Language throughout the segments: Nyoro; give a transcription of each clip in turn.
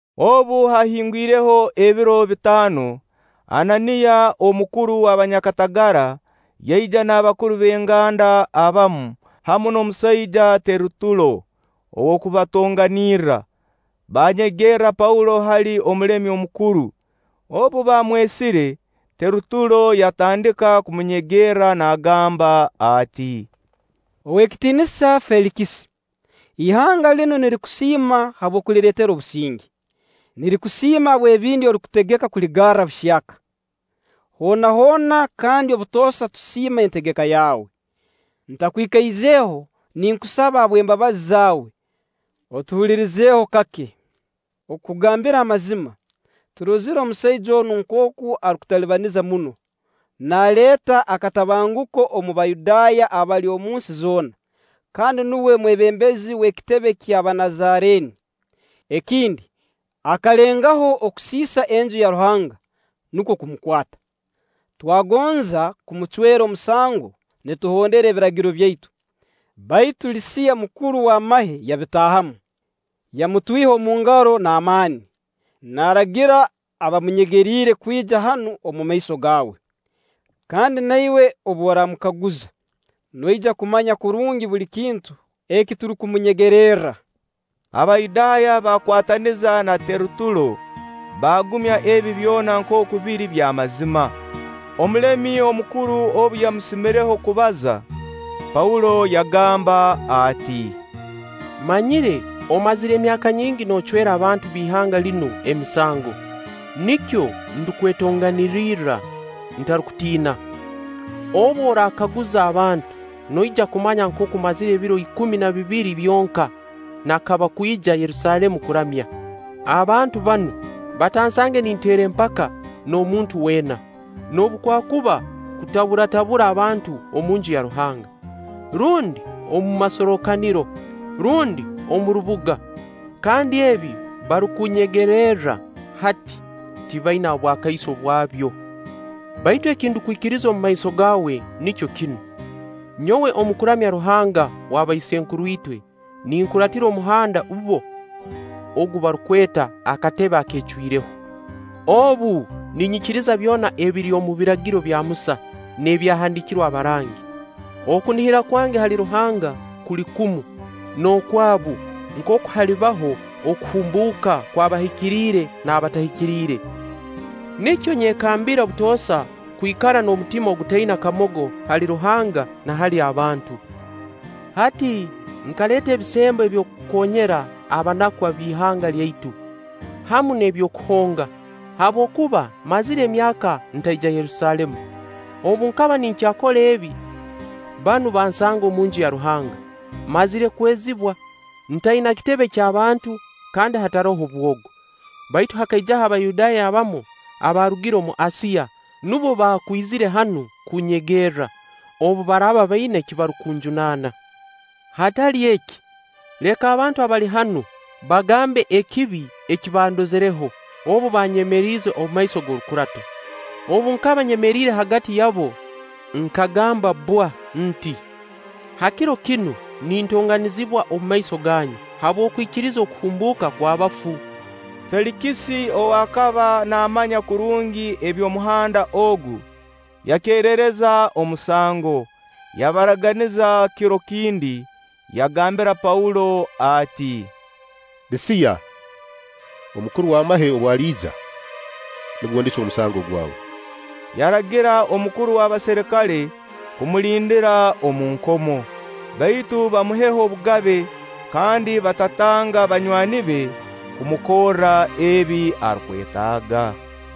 Obu haahingwireho ebiro bitaano, Ananiya, omukuru w'abanyakatagara, yaija n'abakuru b'enganda abamu, hamu n'omusaija Terutulo ow'okubatonganirra. Banyegerra Paulo hali omulemi omukuru. Obu baamwesire, Terutulo yatandika kumunyegerra naagamba ati: “Oweekitiinisa Feelikisi, ihanga linu nirikusiima habw'okulireetera obusinge, nirikusiima habw'ebindi orukutegeka kuligarra obuhyaka. Hoona hoona kandi obutoosa tusiima entegeka yawe. Ntakwikaizeho, ninkusaba habw'embabazi zaawe, otuhulirizeho kake. Okukugambira amazima, turozire omusaija onu nkooku arukututalibaniza muno, naaleeta akatabanguko omu Bayudaaya abali omu nsi zoona, kandi nuwe mwebembezi w'ekitebe ky'Abanazareeni. Ekindi, akalengaho okusiisa Enju ya Ruhanga, nukwo kumukwata. [Twagonza kumucwera omusango nituhondera Ebiragiro byaitu; baitu Lisiya, mukuru w'amahe yabitaahamu, yamutwiha omu ngaro n'amaani, naaragira abaamunyegeriire kwija hanu omu maiso gaawe.] Kandi na iwe obu oramukaguza noija kumanya kurungi buli kintu eki turukumunyegererra.” Abayudaaya bakwataniza na Terutulo, baagumya ebi byona nkooku biri by'amazima. Omulemi omukuru obu yamusimireho kubaza, Paulo yagamba ati; “Mmanyire omazire emyaka nyingi noocwera abantu b'ihanga linu emisango; nikyo ndukwetonganirirra ntarukutiina. Obu orakaguza abantu, noija kumanya nkooku mmazire ebiro ikumi na bibiri byonka nakaba kwija Yerusaalemu kuramya. Abantu banu batansange ninteera empaka n'omuntu weena, noobu kwakuba kutabatabura abantu omunju ya Ruhanga, rundi omu masorrokaniro, rundi omu rubuga. Kandi ebi barukunnyegererra hati, tibaina obwakaiso bwabyo. Baitu eki ndukwikiriza omu maiso gaawe nikyo kinu: Nyowe omu kuramya Ruhanga w'abaisenkuru itwe, ninkuratira Omuhanda bbo ogu barukweta akatebe akeecwireho. Obu, ninyikiriza byona ebiri omu Biragiro bya Musa n'ebyahandiikirwe abarangi. Okunihira kwange hali Ruhanga kuli kumu n'okwabu nkooku halibaho okuhumbuuka kw'abahikiriire n'abatahikiriire. Nikyo nyekambira obutoosa kwikara n'omutima ogutaina kamogo hali Ruhanga na hali abantu. Hati nkaleeta ebisembo eby'okukoonyera abanaku ab'ihanga lyaitu, hamu n'eby'okuhonga, habwokuba mmazire emyaka ntaija Yerusaalemu. Obu nkaba ninkyakora ebi, banu bansanga omunju ya Ruhanga, mmazire kwezibwa, ntaina kitebe ky'abantu kandi hataroho bwogo. Baitu hakaijaho Abayudaaya abamu abaarugire omu Asiya nubo baakwizire hanu kunnyegerra, obu baraaba baina eki barukunjunaana. Hatali eki, leka abantu abali hanu bagambe ekibi eki bandozireho obu baanyemeriize omumaiso g'orukurato. Obu nkaba nyemeriire hagati yabu nkagamba bwa nti: ‘Ha kiro kinu nintonganizibwa omumaiso ganyu habw'okwikiriza okuhumbuuka kw'abafu.’” Feelikisi ow'akaba naamanya kurungi eby'Omuhanda ogu, yakerereza omusango, yabaraganiza kiro kindi, yagambira Paulo ati: “Lisiya omukuru w'amahe obu aliija, nubwo ndicwa omusango gwawe.” Yaragira omukuru w'abaserikale kumulindira omu nkomo, baitu bamuheho obugabe kandi batatanga banywani be kumukorra ebi arukwetaaga.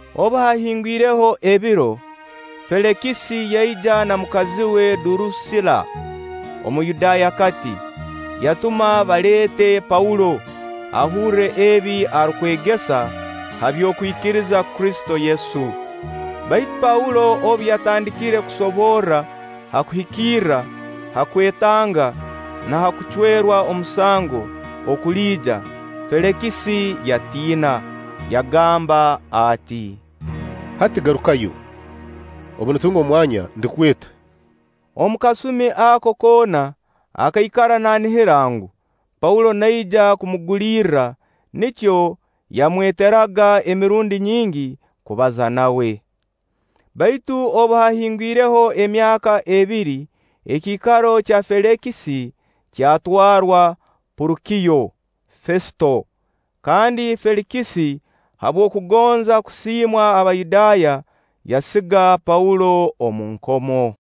Obu haahingwireho ebiro, Feelikisi yaija na mukazi we Durusilla Omuyudaayakati. Yatuma baleete Paulo, ahurre ebi arukwegesa ha by'okwikiriza Kristo Yesu. Baitu Paulo obu yatandikire kusoborra ha kuhikirra, ha kwetanga, na ha kucwerwa omusango okuliija, Feelikisi yatiina, yagamba ati: “Hati garukayo. Obu nditunga omwanya ndikweta.” Omu kasumi ako koona akaikara nanihira ngu, Paulo naija kumugulirra, nikyo yamweteraga emirundi nyingi kubaza nawe. Baitu obu haahingwireho emyaka ebiri, ekiikaro kya Feelikisi kyatwarwa Porukiyo Fesito; kandi Feelikisi habw'okugonza kusiimwa Abayudaaya, yasiga Paulo omu nkomo.